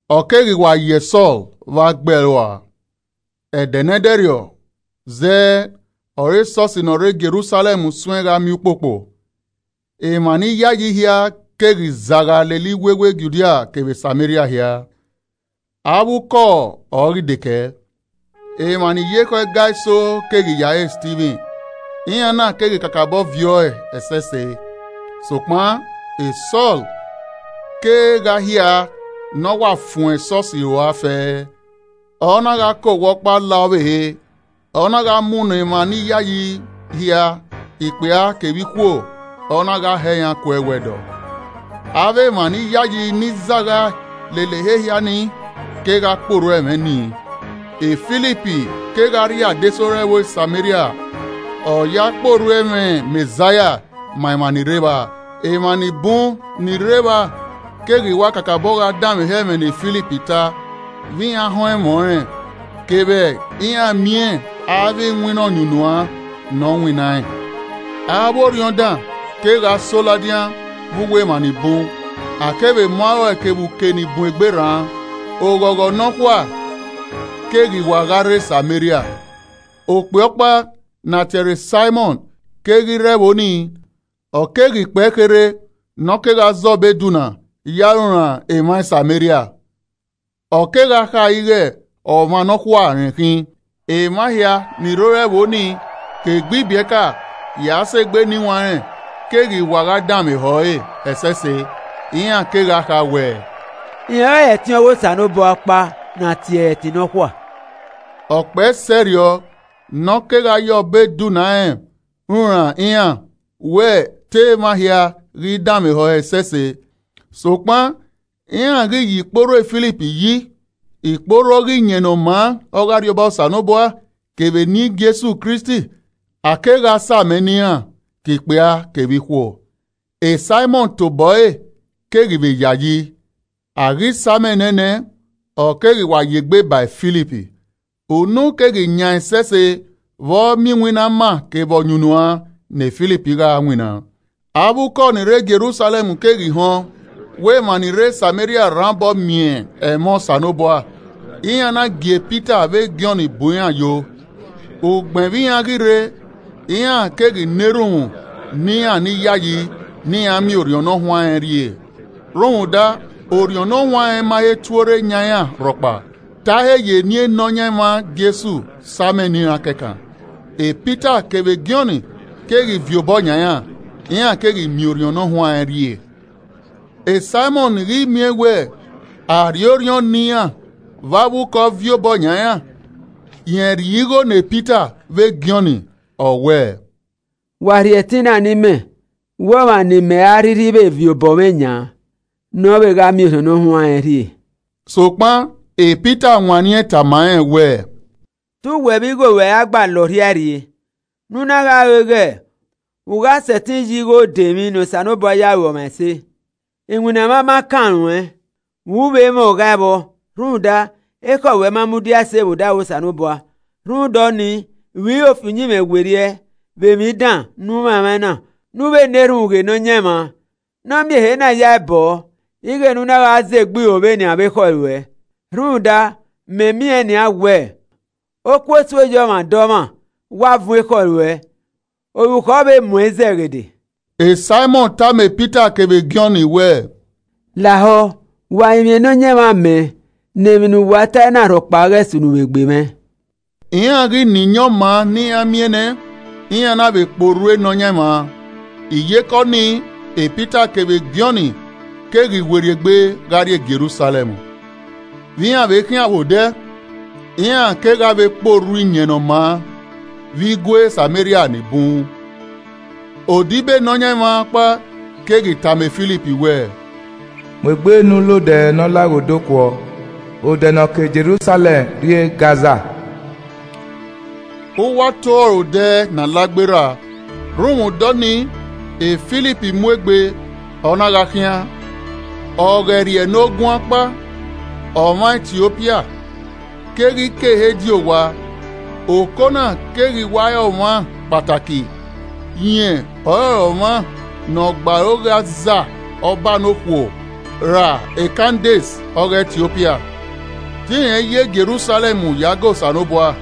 Ọ keghi wa yẹ Sọl wẹ a gbe ẹe rua. E Sọl Kegha Kpokpo Esọsi Ẹdẹ ne ẹdẹrriọ zẹẹ ọre esọsi ne ọ rre Jerusalẹm suẹn gha miẹn ukpokpo. Emwa ni yayi hia keghi zagha lele iwewe Judia kevbe Sameria hia, avbe ukọ ọre ọ ghi de kẹe. Emwa ni ya ekhọe ga eso keghi ya re Stivin, iran na keghi kakabọ viẹ ọe ẹsẹse. Sokpan e Sọl kegha hia ne ọ wa fuẹn esọsi rua fẹẹrẹ, ọ na gha ke owa ọkpa la ọvbehe, ọ na gha munọ emwa ni yayi hia ikpia kevbe ikhuo, ọ na gha hẹ iran ku ẹwẹdọ. Avbe emwa ni yayi ni zagha lele ehe hia nii kegha kpe orhu ẹmwẹ nii. Filip kegha rrie adesẹ ore ẹvbo Sameria, ọ ya kpe orhu ẹmwẹ Mẹzaia ma emwa ni rre evba. Emwa ni bun ni rre evba keghi wa kakabọ gha danmwehọ ẹmwẹ ne Filip ta vbe iran họn ẹmwẹ ọnrẹn, kevbe iran miẹn avbe iwinna ọyunnuan ne ọ winnaẹn. Avbe orhiọn dan kegha so ladian vbe uwu emwa ni bun, a kevbe mu arọe kevbe uke ni bun egbe rra. Oghọghọ nọkhua keghi wa gha rre Sameria. Okpia ọkpa ne a tie ẹre Saimọn keghi rre ẹvbo ni, ọ keghi kpẹe kherhe ne ọ kegha zẹ ọbo edunna ya runran emwa Sameria. Ọ kegha kha ighẹ ọmwa nọkhua rẹn khin. Emwa hia ni rre ore ẹvbo ni, ke egbe ibiẹka ya sẹ egbe eniwanrẹn, keghi wa gha danmwehọ ẹre ẹsẹse. Iran kegha kha wẹẹ, “Rẹn ọrọre ẹtin ọghe Osanobua ọkpa ne a tie ẹre ‘Ẹtin Nọkhua.’” Ọ kpẹe sẹrriọ ne ọ kegha ya obọ edunna rẹn runran iran wẹ te emwa hia ghi danmwehọ ẹre ẹsẹse. Sokpan iran ghi ya ikporhu e Filip yi, ikporhu ọghe Iyẹn Ne ọ maa ọghe Arriọba Osanobua kevbe eni Jesu Kristi, a kegha sa amẹ ne iran, ke ikpia kevbe ikhuo. Saimọn tobọ ẹre keghi vbe yayi, a ghi sa amẹ nẹẹn nẹ, ọ keghi wa ya egbe ba e Filip, unu keghi yaẹn ẹsẹse vbe ọ miẹn iwinna ama kevbe ọyunnuan ne Filip gha winna. Avbe ukọ ni rre Jerusalẹm keghi họn wẹ emwa ni rre Sameria rhan obọ miẹn ẹmwẹ Osanobua, iran na gie Pita vbe Jọn bu iran yo. Ugbẹn vbe iran ghi rre, iran keghi na erhunmwu ne iran ni yayi ne iran miẹn Orhiọn Ne Ọ Huanrẹn rhie. Rhunmwuda Orhiọn Ne Ọ Huanrẹn ma he tuorre yan iran rhọkpa, te a he ya eni Nọyaẹnmwa Jesu sa amẹ ne iran kẹkan. Pita kevbe Jọn keghi viọ obọ yan iran, iran keghi miẹn Orhiọn Ne ọ huanrẹn rhie. Saimọn ghi miẹn wẹ a rhie Orhiọn ne iran vbe avbe ukọ viọ obọ yan iran, rẹn rhie igho ne Pita vbe Jọn, ọ wẹẹ, “Wa rhie ẹtin na ne imẹ wẹ ọmwa ne imẹ a rhirhi vbe viọ obọ mwẹ yan, ne ọ vbe gha miẹn Orhiọn Ne Ọ Huanrẹn rhie.” Sokpan Pita wanniẹn tama rẹn wẹẹ, “Te uwẹ vbe igho ruẹ ra gba la ọrhiae rrie, ne u na gha ro ighẹ u gha sẹtin ya igho dẹ emwi ne Osanobua ya ru ọmwa ẹse. Iwinna mwa ma kan ruẹn, u i vbe mwẹ oghae vbọ, rhunmwuda ekhọe ruẹ ma mudia ẹse vbẹ odaro Osanobua. Rhunmwuda ọnii, ro iro fi uyinmwẹ werriẹ vbe emwi dan ne u mwamwaẹn na, ne u vbe na erhunmwu ghe Nọyaẹnmwa, ne ọ miẹn ehe na ya ẹe bọ ọ ighẹ ne u na gha zẹ egbe iro vbe nian vbe ekhọe ruẹ. Rhunmwuda mẹ miẹn nian wẹ okuosu oyọmwadọmwa wa vuọn ekhọe ruẹ, orukhọ vbe mu ẹn izẹghede.” Saimọn tama Pita kevbe Jọn wẹẹ, “Lahọ wa rinmwian Nọyaẹnmwa mẹ ne emwi ne uwa tae na rhọkpa ghẹ sunu vbe egbe mwẹ.” Iran ghi na iyẹn ọma ne iran miẹn nẹ, iran na vbe kpe orhu e Nọyaẹnmwa. Iyeke ọnii Pita kevbe Jọn keghi werriegbe gha rrie Jerusalẹm. Vbe iran vbe khian vbe odẹ, iran kegha vbe kpe orhu Iyẹn Ne ọ maa vbe igue Sameria ni bun. Odibo Nọyaẹnmwa ọkpa keghi tama Filip wẹẹ, “Mu egbe ne u la odẹ ne ọ laghe odẹ okuọ, odẹ ne ọ ke Jerusalẹm rrie Gaza.” (Uwu ato ọre odẹ na la gberra.) Rhunmwuda ọnii, Filip mu egbe, ọ na gha khian. Ọghẹrriẹnoguan ọkpa, ọmwa Etiopia keghi ke ehe di owa. Okona keghi wa re ọmwa kpataki, rẹn ọrọre ọmwa ne ọ gbe aro ghe aza ọba nokhuo ra Kandes ọghe Etiopia. Te irẹn yo Jerusalẹm ya ga Osanobua.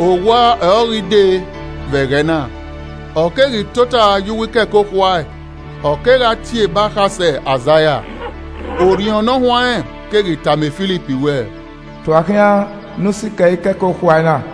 Owa ọre ọ ghi de vbe ẹghẹ na, ọ keghi tota ye uwu ikẹkẹ okhuae, ọ kegha tie ebe akhasẹ Aizaia. Orhiọn Ne Ọ Huanrẹn keghi tama Filip wẹẹ, “Tua okhian ne u sikẹ ikẹkẹ okhuae na.”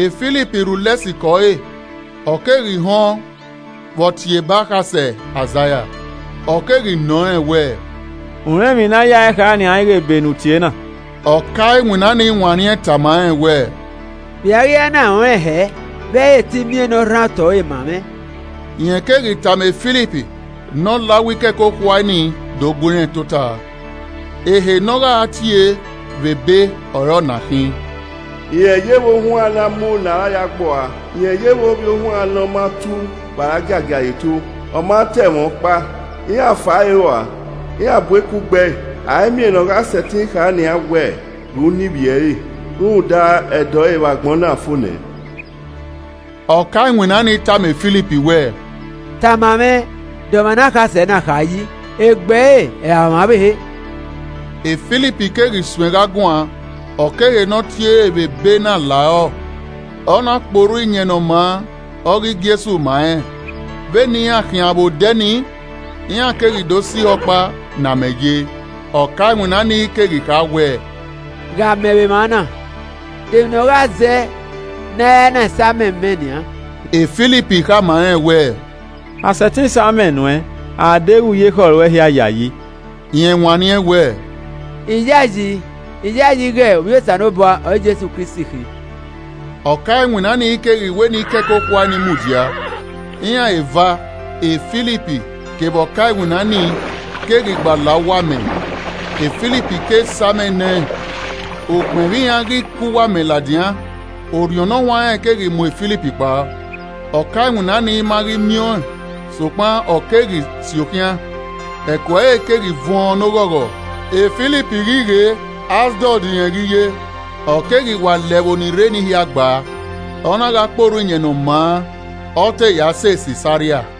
Filip rhulẹ sikẹ ọre, ọ keghi họn vbe ọ tie ebe akhasẹ Aizaia ọ keghi nọ rẹn wẹẹ, “U rẹn emwi ne a yae kha nian ighẹ ebe e u tie na?” Ọka iwinna ni wanniẹn tama rẹn wẹẹ, “Vbe I a ghi ra na rẹn ọnrẹn hẹ vbe ẹ i re te I miẹn ne ọ rhan otọ ẹre ma mwẹ.” Rẹn keghi tama Filip ne ọ la uwu ikẹkẹ okhuae nii do gu irẹn tota. Ehe ne ọ gha tie vbe ebe ọre ọna khin: “Rẹn yevbe ohuan ne a mu ne a ra ya gbe ua, rẹn yevbe ovbiohuan ne ọ ma tu vbe a giagia re eto. Ọ ma ta ẹmwẹ ọkpa. Iran fa ẹre rua, iran bu eku gbe ẹe. A i miẹn ne ọ gha ghi sẹtin kha nian wẹ ghe uniẹn ivbi ẹre. Rhunmwuda, ẹdẹ ọre vbe agbọn na fo nẹ.” Ọka iwinna ni tama Filip wẹẹ, “Tama mwẹ, de ọmwa ne akhasẹ na kha yi? Egbe ẹre ra ọmwa ọvbehe?” Filip keghi suẹn gha guan, ọ ke ehe ne ọ tie re vbe ebe na la rọ, ọ na kpe orhu Iyẹn Ne ọ maa ọghe Jesu ma rẹn. Vbene iran khian vbe odẹ nii, iran keghi do sẹ ihe ọkpa ne amẹ ye, ọka iwinna ni keghi kha wẹẹ, “Ghe amẹ vbe emwa na, de emwi ne ọ gha zẹ ne a i ra na sa amẹ mẹ nian?” [ Filip khama rẹn wẹẹ, “A sẹtin sa amẹ nuẹ a deghẹ u ya ekhọe ruẹ hia yayi?” Rẹn wanniẹn wẹ, “I yayi, I yayi ghe Ovbi Osanobua ọre Jesu Kristi khin.”] Ọka iwinna nii keghi wẹ ne ikẹkẹ okhuae ni mudia. Iran eva, Filip kevbe ọka iwinna nii keghi gba la uwu amẹ, Filip ke sa amẹ nẹ ẹn. Ugbẹn vbe iran ghi ke uwu amẹ ladian, Orhiọn Nọyaẹnmwa keghi mu Filip kpao. Ọka iwinna nii ma ghi miẹn ọẹn sokpan ọ keghi si okhian, ẹko ẹre keghi vuọn ne oghọghọ. Filip ghi ghe Asdọd rẹn ghi ye, ọ keghi wa la ẹvbo ni rre eni hia gba, ọ na gha kpe orhu Iyẹn Ne ọ maa ọ te ya sẹ Sisaria.